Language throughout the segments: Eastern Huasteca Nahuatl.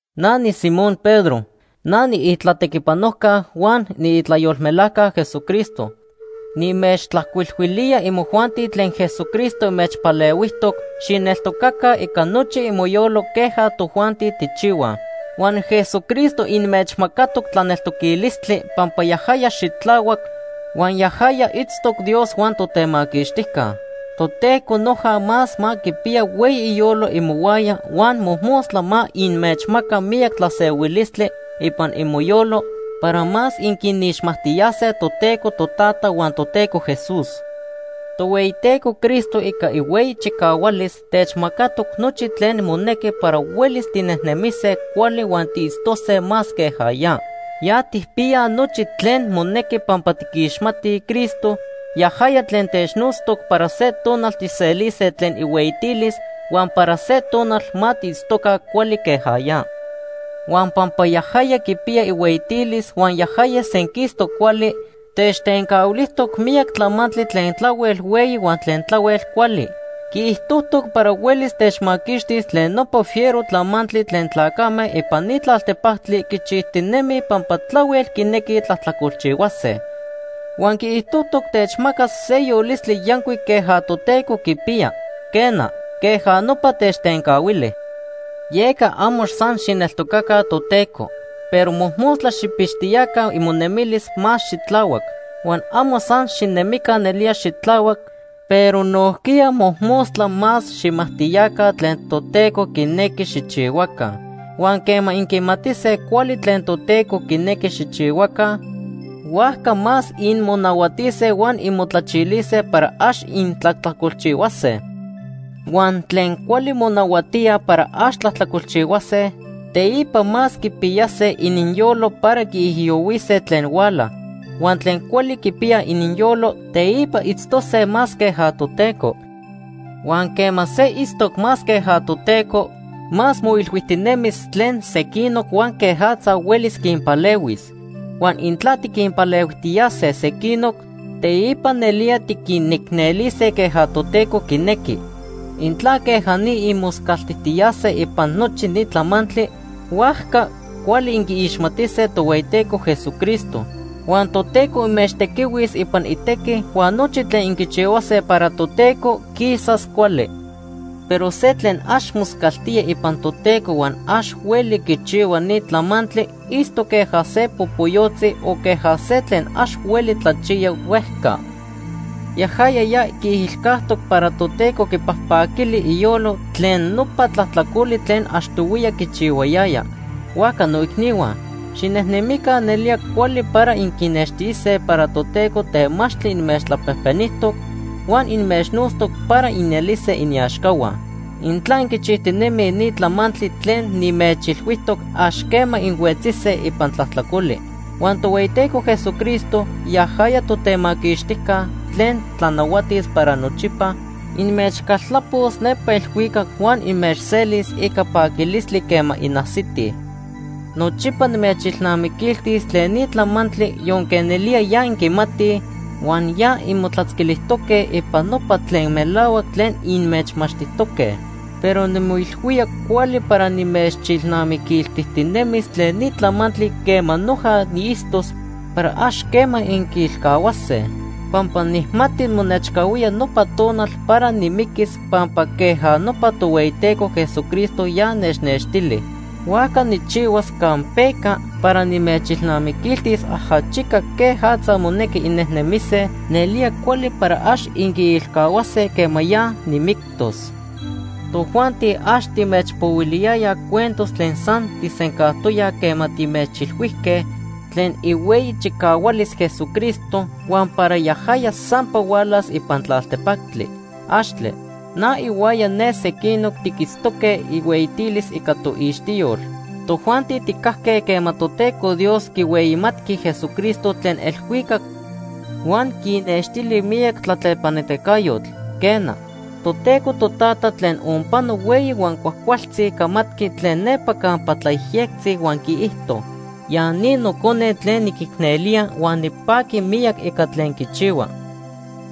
Na niSimón Pedro. Na niitlatequipanojca huan niitlayolmelajca Jesucristo. Nimechtlajcuilhuilía imojuanti tlen Jesucristo inmechpalehuijtoc xijneltocaca ica nochi imoyolo queja tojuanti tijchihuaj. Huan Jesucristo inmechmacatoc tlaneltoquilistli pampa yajaya xitlahuac, huan yajaya itztoc Dios huan Totemaquixtijca. Toteco noja más ma quipiya hueyi iyolo imohuaya huan mojmostla ma inmechmaca miyac tlasehuilistli ipan imoyolo para más inquinixmajtiyase Toteco Totata huan Toteco Jesús. Tohueyiteco Cristo ica ihueyi chicahualis techmacatoc nochi tlen monequi para huelis tinejnemise cuali huan tiitztose más queja ya. Ya tijpiyaj nochi tlen monequi pampa tiquixmatij Cristo, yajaya tlen technotztoc para se tonal tijselise tlen ihueyitilis huan para se tonal ma tiitztoca cuali queja ya. Huan pampa yajaya quipiya ihueyitilis huan yajaya senquistoc cuali, techtencahuilijtoc miyac tlamantli tlen tlahuel hueyi huan tlen tlahuel cuali. Quiijtojtoc para huelis techmaquixtis tlen nopa fiero tlamantli tlen tlacame ipan ni tlaltepactli quichijtinemij pampa tlahuel quinequij tlajtlacolchihuase. Huan quiijtojtoc techmacas se yolistli yancuic queja Toteco quipiya. Quena, queja nopa techtencahuili. Yeca amo san xijneltocaca Toteco, pero mojmostla xijpixtiyaca imonemilis más xitlahuac. Huan amo san xinemica nelía xitlahuac, pero nojquiya mojmostla más xijmajtiyaca tlen Toteco quinequi xijchihuaca. Huan quema inquimatise cuali tlen Toteco quinequi xijchihuaca, huajca más inmonahuatise huan inmotlachilise para ax intlajtlacolchihuase. Huan tlen cuali monahuatíaj para ax tlajtlacolchihuase, teipa más quipiyase ininyolo para quiijiyohuise tlen huala. Huan tlen cuali quipiyaj ininyolo, teipa itztose más queja Toteco. Huan quema se itztoc más queja Toteco, más moilhuijtinemis tlen sequinoc huan quejatza huelis quinpalehuis. Huan intla tiquinpalehuijtiyase sequinoc, teipa nelía tiquinicnelise queja Toteco quinequi. Intla queja ni inmoscaltijtiyase ipan nochi ni tlamantli, huajca cuali inquiixmatise Tohueyiteco Jesucristo. Huan Toteco inmechtequihuis ipan itequi huan nochi tlen inquichihuase para Toteco quisas cuali. Pero se tlen ax moscaltía ipan Toteco huan ax hueli quichihua ni tlamantli itztoc queja se popoyotzi o queja se tlen ax hueli tlachiya huejca. Yajaya ya quiilcajtoc para Toteco quipajpaquili iyolo tlen nopa tlajtlacoli tlen achtohuiya quichihuayaya. Huajca noicnihua, xinemica nelía cuali para inquinextise para Toteco temachtli inmechtlapejpenijtoc huan inmechnotztoc para inelise iniaxcahua. Intla inquichijtinemij ni tlamantli tlen nimechilhuijtoc, ax quema inhuetzise ipan tlajtlacoli. Huan Tohueyiteco Jesucristo, yajaya Totemaquixtijca, tlen tlanahuatis para nochipa, inmechcaltlapos nepa elhuicac huan inmechselis ica paquilistli quema inajsitij. Nochipa nimechilnamiquiltis tlen ni tlamantli yonque nelía ya inquimatij huan ya inmotlatzquilijtoque ipan nopa tlen melahuac tlen inmechmachtijtoque. Pero nimoilhuía cuali para nimechilnamiquiltijtinemis tlen ni tlamantli quema noja niitztos para ax quema inquiilcahuase. Pampa nijmati monechcahuía nopa tonal para nimiquis pampa queja nopa Tohueyiteco Jesucristo ya nechnextili. Huajca nijchihuas campeca para nimechilnamiquiltis ajachica quejatza monequi innejnemise nelía cuali para ax inquiilcahuase quema ya nimictos. Tojuanti ax timechpohuiliyayaj cuentos tlen san tijsencajtoyaj quema timechilhuijque tlen ihueyi chicahualis Jesucristo huan para yajaya sampa hualas ipan tlaltepactli. ¡Axtle! Na ihuaya ne sequinoc tiquitztoque ihueyitilis ica toixtiyol. Tojuanti tijcajque quema Toteco Dios quihueyimatqui Jesucristo tlen elhuicac huan quinextili miyac tlatlepanitacayotl. Quena, Toteco Totata tlen onpano hueyi huan cuajcualtzi camatqui tlen nepa campa tlayejyectzi huan quiijto: “Ya ni Nocone tlen niquicnelía huan nipaqui miyac ica tlen quichihua.”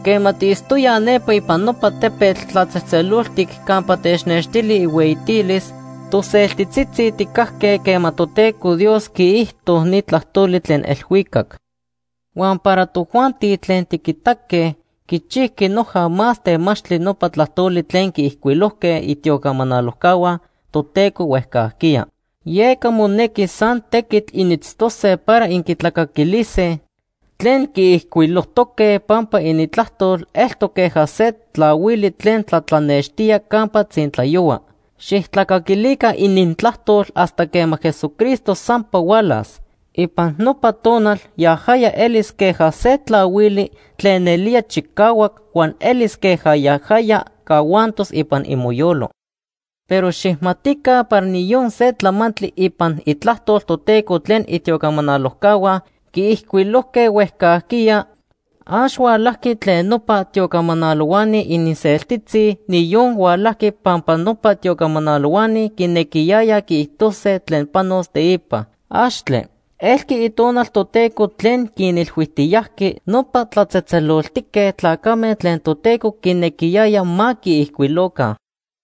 Quema tiitztoyaj nepa ipan nopa tepetl tlatzejtzeloltic campa technextili ihueyitilis, toseltitzitzi tijcajque quema Toteco Dios quiijto ni tlajtoli tlen elhuicac. Huan para tojuanti tlen tiquitaque, quichijqui noja más temachtli nopa tlajtoli tlen quiijcuilojque itiocamanalojcahua Toteco huejcajquiya. Yeca monequi san tequitl initztose para inquitlacaquilise tlen quiijcuilojtoque pampa inintlajtol eltoc queja se tlahuili tlen tlatlanextía campa tzintlayohua. Xijtlacaquilica inintlajtol hasta quema Jesucristo sampa hualas. Ipan nopa tonal yajaya elis queja se tlahuili tlen nelía chicahuac, huan elis queja yajaya cahuantos ipan imoyolo. Pero xijmatica para niyon se tlamantli ipan Itlajtol Toteco tlen itiocamanalojcahua quiijcuilojque huejcajquiya, ax hualajqui tlen nopa tiocamanalohuani ininseltitzi, niyon hualajqui pampa nopa tiocamanalohuani quinequiyayaj quiijtose tlen panos teipa. ¡Axtle! Elqui Itonal Toteco tlen quinilhuijtiyajqui nopa tlatzejtzeloltique tlacame tlen Toteco quinequiyaya ma quiijcuiloca.